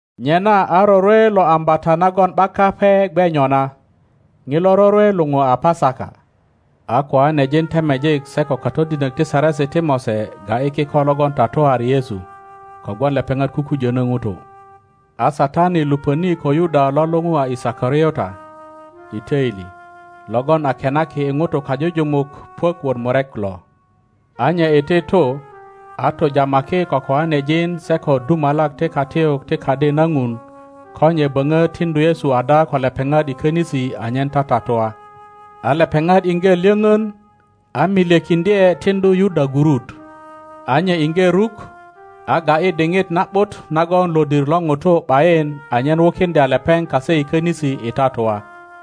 Nyena a rorwe lo Ambata nagon ’bak Kape gwe nyona.Ŋilo rorwe luŋu a Pasaka. A koanejin temejik se ko katodinök ti Saresi ti Mose ga ’yi kiko logon tatuari Yesu, kogwon lepeŋat kukujönö ŋutu. A Satani lupöni ko Yuda lo luŋu a Isikariota i toili, logon a kenaki i ŋutu kajujumuk puök wot murek lo; a nye iti tu, a tujamaki ko koanejin se ko dumalak ti katiyuk ti Kadi na Ŋun ko nye böŋö tiŋdu Yesu ada ko lepeŋat i könisi anyen tatatua. A lepeŋat iŋge lyöŋön, a milyekiŋdye tiŋdu Yuda gurut. A nye iŋge ruk, a ga ’yi diŋit na ’but nagon lodir lo ŋutu ’bayin anyen wukiŋdya lepeŋ kase i könisi i tatua.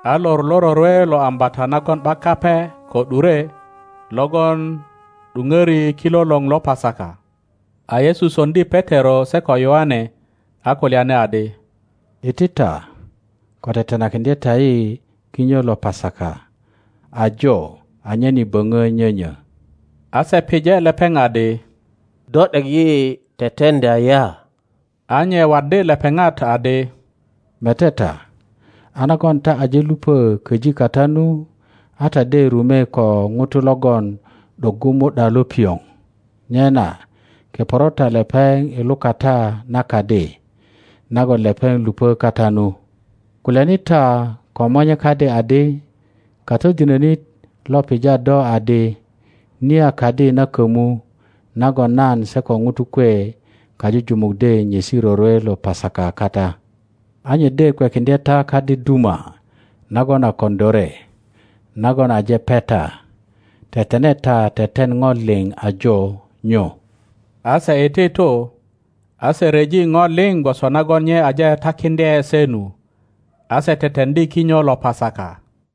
A lor lo rorwe lo Ambata nagon ’bak Kape ko ’dure, logon ’duŋöri kilolor lo Pasaka. A Yesu soŋdi Petero se ko Yoane, a kulyani adi, Iti ta, ko tetenakiŋdye ta yi kinyo lo Pasaka ajo anyen yi böŋö nyonyö. A se pije lepeŋ adi, Do ’dek yi teteŋdya ya? A nye waddi lepeŋat adi, Mete ta, a nagon ta aje lupö köji kata nu, a ta de rume ko ŋuto logon ’doggu mu ’da lo pioŋ. Nyena keporo ta lepeŋ i lukata na kadi nagon lepeŋ lupö kata nu; kulyani ta ko monye kadi adi, Katodinönit lo pija do adi, Niya kadi na kömu nagon nan se ko ŋutu kwe kajujumuk de nyesi rorwe lo pasaka kata? A nye de kwekiŋdye ta kadi duma nagon a koŋilore nagon aje peta; tetene ta teten ŋo liŋ ajo nyu. A se iti tu, a se ryeji ŋo liŋ gwoso nagon nye aje takiŋdye se nu; a se teteŋdi kinyo lo Pasaka,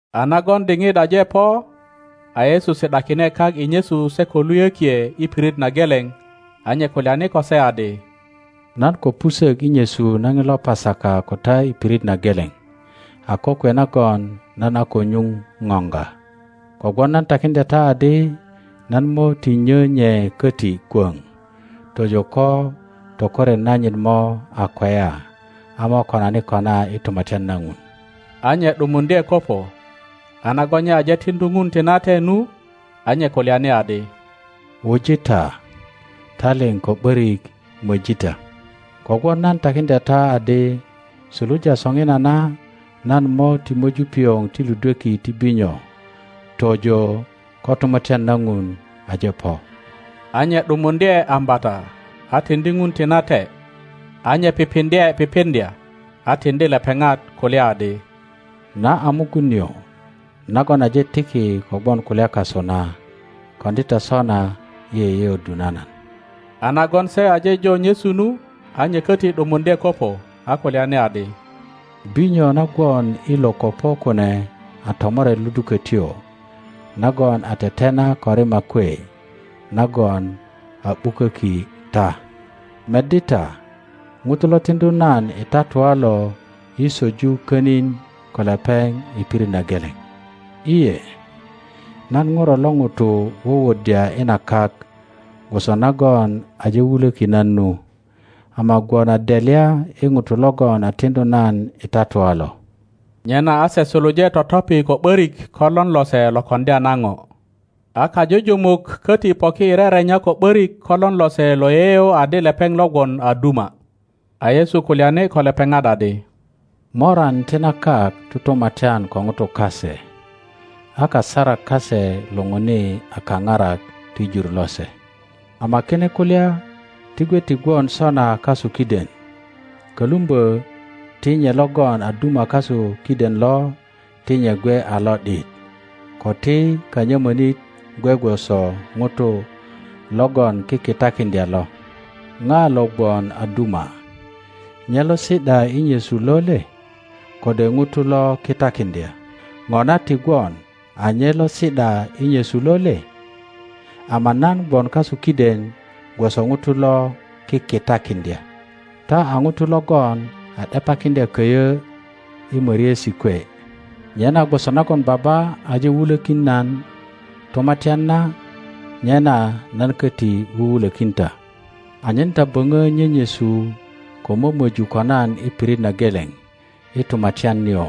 A nagon diŋit aje po, a Yesu si ’dakine kak i nyesu se ko luyökie i pirit na geleŋ, a nye kulyani ko se adi, Nan ko pusök i nyesu na ŋilo Pasaka ko ta i pirit na geleŋ a kokwe nagon nan a ko nyuŋ ŋoŋga, kogwon nan takiŋdya ta adi, nan mo ti nyö nye koti kwöŋ tojo ko tokoret nanyit mo a kweya a mo konani kona i Tumatyan na Ŋun. a nye ’dumuŋdye kopo, a nagon nye aje tiŋdu Ŋun tinate nu, a nye kulyani adi, Wuji ta, ta liŋ ko ’börik möji ta; kogwon nan takiŋdya ta adi, suluja soŋinana nan mo ti möju pioŋ ti ludweki ti binyo tojo ko Tumatyan na Ŋun aje po. A nye ’dumuŋdye ambata, a tiŋdi Ŋun tinate, a nye pipiŋdye pipiŋdya a tiŋdi lepeŋat, kulya adi, Na a mugun nio nagon aje tiki kogwon kulya kasu na. [Koŋdi ta sona i yeyeöddu na nan. a nagon se aje jo nyesu nu, a nye köti ’dumuŋdye kopo, a kulyani adi, Binyo na gwon i lo kopo kune a tomoret ludukötyo nagon a tetena ko rima kwe, nagon a ’buköki ta.] Meddi ta, ŋuto lo tiŋdu nan i tatua lo yi söju konin ko lepeŋ i pirit na geleŋ. Te, nan ŋuro lo ŋuto wuwuddya i na kak gwoso nagon aje wulöki nan nu, ama gwon a delya i ŋuto logon a tiŋdu nan i tatua lo! Nyena a se suluje totopi ko ’börik ko lon lose lo koŋdya na ŋo. A kajujumuk koti poki i rerenya ko ’börik ko lon lose lo yeyeŋ adi lepeŋ lo gwon a duma. a Yesu kulyani ko lepeŋat adi, Moran ti na kak tutumatyan ko ŋutu kase, a kasarak kase luŋuni a Kaparak ti jur lose. Ama kine kulya ti gwe ti gwon sona kasu kiden; kolumbö ti nye logon a duma kasu kiden lo ti nye gwe a lo ’dit, ko ti kanyömönit gwe gwoso ŋuto logon kikitakiŋdya lo. Ŋa lo gwon a duma, nye lo si ’da i nyesu lo le, kode ŋuto lo kitakiŋdya? Ŋona ti gwon a nye lo si ’da i nyesu lo le? Ama nan gwon kasu kiden gwoso ŋuto lo kikitakiŋdya. Ta a ŋutu logon a ’depakiŋdya köyö i möriesi kwe; nyena gwoso nagon Baba aje wulökin nan tumatyan na, nyena nan köti wuwulökin ta anyen ta böŋö nyenyesu ko mömöju ko nan i pirit na geleŋ i tumatyan nio,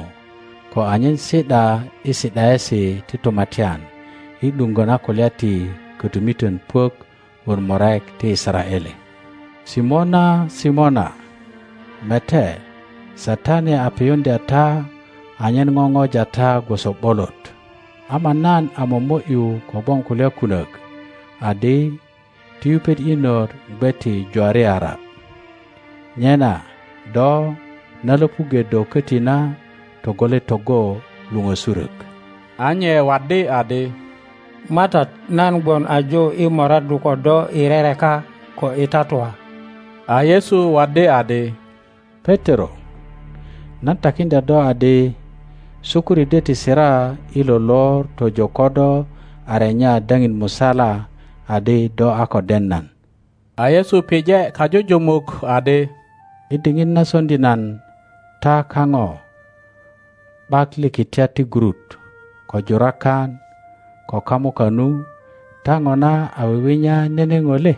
ko anyen si ’da i si ’daesi ti tumatyan i ’duŋgö na kulya ti kötumiton puök wot murek ti Yisaraele. Simona, Simona, mete, Satani a piyuŋdya ta anyen ŋoŋoja ta gwoso ’bolot; ama nan a momo ’yu kogwon kulya kunok adi ti yupet inot gwe ti Iwariara. Nyena do, na löpuŋge do koti na, togole togo luŋösurök. a nye waddi adi, MATAT nan gwon ajo i moraddu ko do i rereka ko i tatua. A Yesu waddi adi, Petero, nan takiŋdya do adi, sukuri de ti sira i lo lor tojo do a renya daŋin musala adi do a ko den nan. A Yesu pije kajujumuk adi, I diŋit na soŋdi nan ta kaŋo ’bak likitiat ti gurut, ko jurakan ko kamuka nu, ta ŋona a wiwinya nene ŋo le?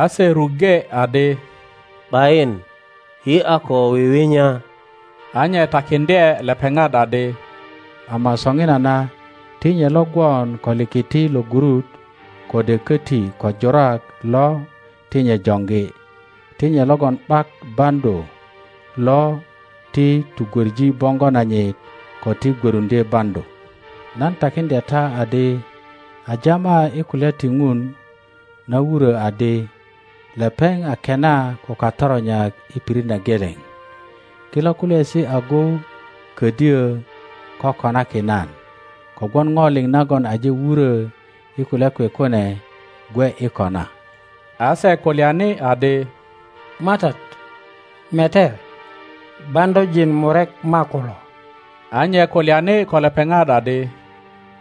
A se ruŋge adi, ’Bayin, yi a ko wiwinya. a nye takiŋdye lepeŋat adi, Ama soŋinana ti nye lo gwon ko likiti lo gurut kode köti kojurak lo ti nye joŋgi, ti nye logon ’bak baŋdu lo ti tugwoŋi boŋgo nanyit ko ti gwöruŋdye baŋdu. Nan takiŋdya ta adi, A jama i kulya ti Ŋun na wurö adi, Lepeŋ a kena ko katoronyak i pirit na geleŋ. Kilo kulyaesi agu ködyö kokonaki nan, kogwon ŋo liŋ nagon aje wurö i kulya kwe kune gwe i kona. A se kulyani adi, MATAT, mete, baŋdujin murek makulo. A nye kulyani ko lepeŋat adi,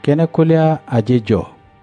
Kine kulya aje jo.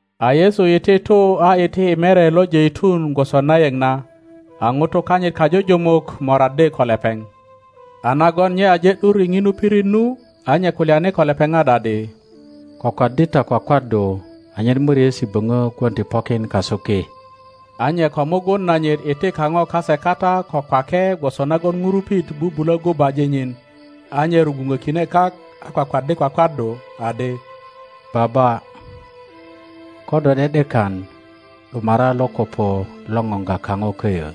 A Yesu iti tu a iti i Mere lo Jeitun gwoso na yeŋ na; a ŋutu kanyit kajujumuk moraddi ko lepeŋ. a nagon nye aje ’dur i ŋinu pirit nu, a nye kulyani ko lepeŋat adi, Kwakwaddi ta kwakwaddu, anyen moriesi böŋo gwon ti pokin kasu ki. a nye ko mugun nanyit iti kaŋo kase kata ko kwake gwoso nagon ŋurupit bubulo gubaji nyin, a nye rugwuŋökine kak a kwakwaddi kwakwaddu, adi, Baba, ko do ’de ’dekan, ’dumara lo kopo lo ŋoŋga kaŋo köyö,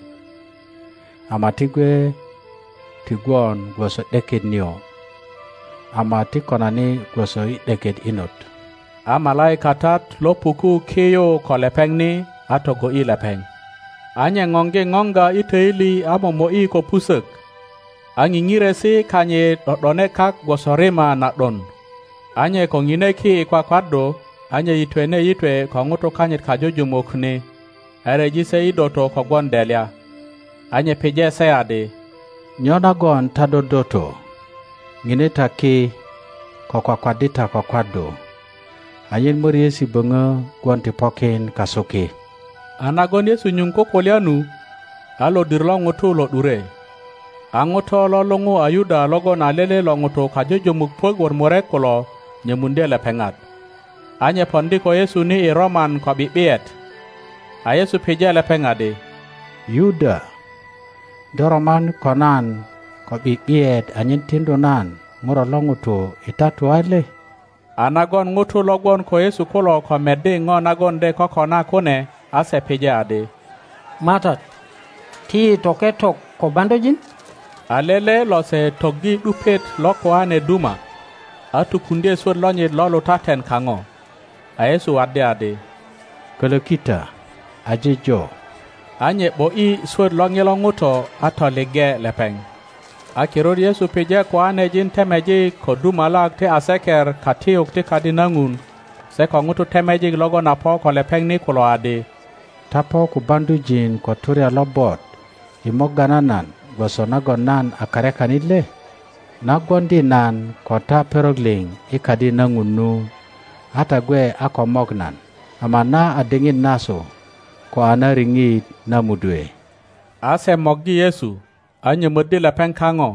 ama ti gwe ti gwon gwoso ’deket nio, ama ti konani gwoso i ’deket inot. [ A malaikatat lo puku ki yu ko lepeŋ ni, a togo ’yi lepeŋ. a nye ŋoŋgi ŋoŋga i töili a momo ’yi ko pusök, a ŋiŋiresi kanyit ’do ’done kak gwoso rima na ’don.] a nye ko ŋine ki i kwakwaddu, a nye yitwene yitwe ko ŋutu kanyit kajujumuk ni, a ryeji se i doto kogwon delya. a nye pije se adi, Nyo nagon ta dodoto? Ŋine ta ki ko kwakwaddi ta kwakwaddu anyen möriesi böŋö gwon ti pokin kasu ki. A nagon Yesu nyuŋ kukulya nu, a lodir lo ŋutu lo ’dure. A ŋuto lo luŋu a Yuda logon a lele lo ŋutu kajujumuk puök wot murek kulo nyömuŋdye lepeŋat. A nye poŋdi ko Yesu ni i roman ko ’bi ’biyet. a Yesu pije lepeŋ adi, Yuda, do roman ko nan ko ’bi ’biyet anyen tiŋdu nan ŋuro lo ŋuto i tatua le? A nagon ŋutu lo gwon ko Yesu kulo ko meddi ŋo nagon de kokona kune, a se pije adi, MATAT, ti yi toke tok ko baŋdujin? A lele lose toggi ’dupiet lo koane duma, a tukuŋdye swöt lonyit lo lutaten kaŋo. A Yesu waddi adi, Kolöki ta! Aje jo! A nye ’bo ’yi swöt lo ŋilo ŋuto a toliŋge lepeŋ. A kirut Yesu pije koanejin temejik ko dumalak ti aseker katiyuk ti Kadi na Ŋun se ko ŋutu temejik logon a po ko lepeŋ ni kulo adi, Ta po ko baŋdujin ko turya lobot i morga na nan gwoso nagon nan a karyakanit le? Na gwoŋdi nan ko ta perok liŋ i Kadi na Ŋun nu, a ta gwe a ko mok nan. Ama na a diŋit nasu, ko a na riŋit na mudwe. A se morgi Yesu, a nyömöddi lepeŋ kaŋo,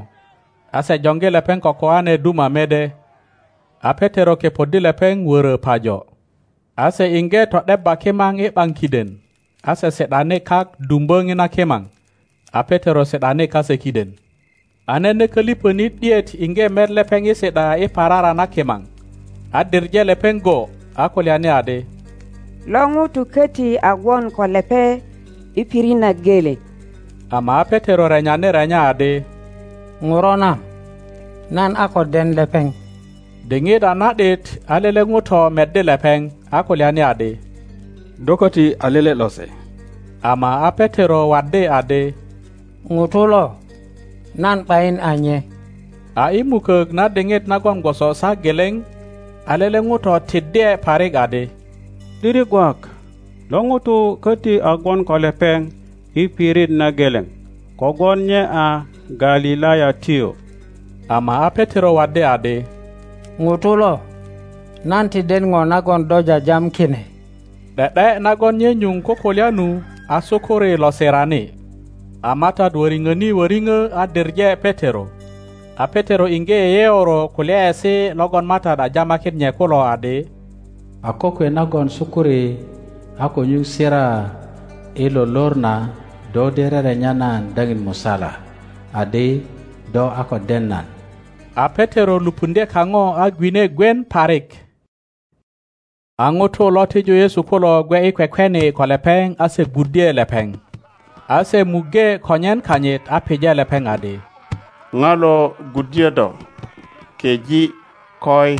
a se joŋgi lepeŋ ko koane duma mede. A Petero kepoddi lepeŋ wörö pajo. A se iŋge to ’debba kimaŋ i ’baŋ kiden, a se si ’dani kak dumbö ŋina kimaŋ, a Petero si ’dani kase kiden. a nene koliŋonit ’diet iŋge met lepeŋ i si ’da i parara na kimaŋ, a diŋe lepeŋ go, a kulyani adi, Lo ŋuto köti a gwon ko lepeŋ i pirit na geleŋ. Ama a Petero renyani renya adi, ŋuro na, nan a ko den lepeŋ. Diŋit a na ’dit, a lele ŋuto meddi lepeŋ, a kulyani adi, Do köti a lele lose. Ama a Petero waddi adi, Ŋuto lo, nan ’bayin a nye. a i mukök na diŋit nagon gwoso saa geleŋ, a lele ŋuto tiddye parik adi, ’Diri gwak lo ŋuto köti a gwon ko lepeŋ i pirit na geleŋ, kogwon nye a Galilayatyo. Ama a Petero waddi adi, Ŋuto lo, nan ti den ŋo nagon do jajam kine. ’De ’de nagon nye nyuŋ kukulya nu, a sukuri lo sirani. A MATAT wöriŋöni woriŋo a diŋe Petero, a Petero iŋge yeyeoro kulyaesi logon MATAT a jamakin nye kulo adi. A kokwe nagon sukuri a ko nyuŋ sira i lo lor na, do de rerenya nan daŋin musala adi do a ko den nan. A Petero lupuŋdye kaŋo a gwine gwien parik. A ŋutu lo tiju Yesu kulo gwe i kwekweni ko lepeŋ a se gwuddye lepeŋ. A se muŋge konyen kanyit a pije lepeŋ adi, Ŋa lo gwuddyö do? Keŋ koi!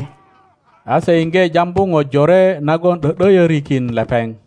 A se iŋge jambu ŋo jore nagon ’dö ’doyorikin lepeŋ.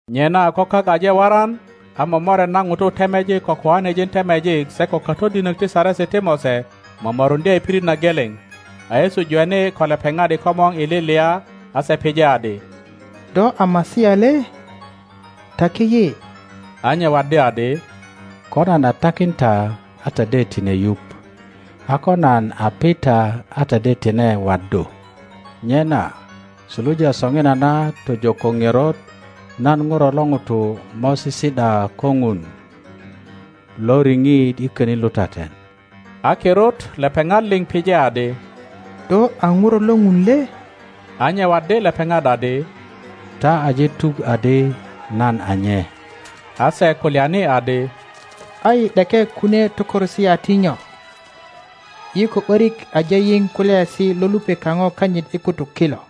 Nyena ko kak aje waran, a momoret na ŋutu temejik ko koanejin temejik se ko katodinök ti Saresi ti Mose momoruŋdye i pirit na geleŋ, a Yesu jweni ko lepeŋat i komor i lilia, a se pije adi, Do a Masia le? Taki yi. A nye waddi adi, Ko nan a takin ta a ta de tine yuŋ; a ko nan a pi ta a ta de tine waddu. Nyena suluja soŋinana tojo ko ŋerot nan ŋuro lo ŋuto mo sisi ’da ko ŋun Loriŋit i könin lutaten. a kirut lepeŋat liŋ pije adi, Do a Ŋuro lo Ŋun le? A nye waddi lepeŋat adi, Ta aje tuk adi nan a nye. a se kulyani adi, A yi ’deke kunie tökoresi a ti nyo? Yi ko ’borik aje yiŋ kulyaesi lo lupe kaŋo kanyit i kutuk kilo.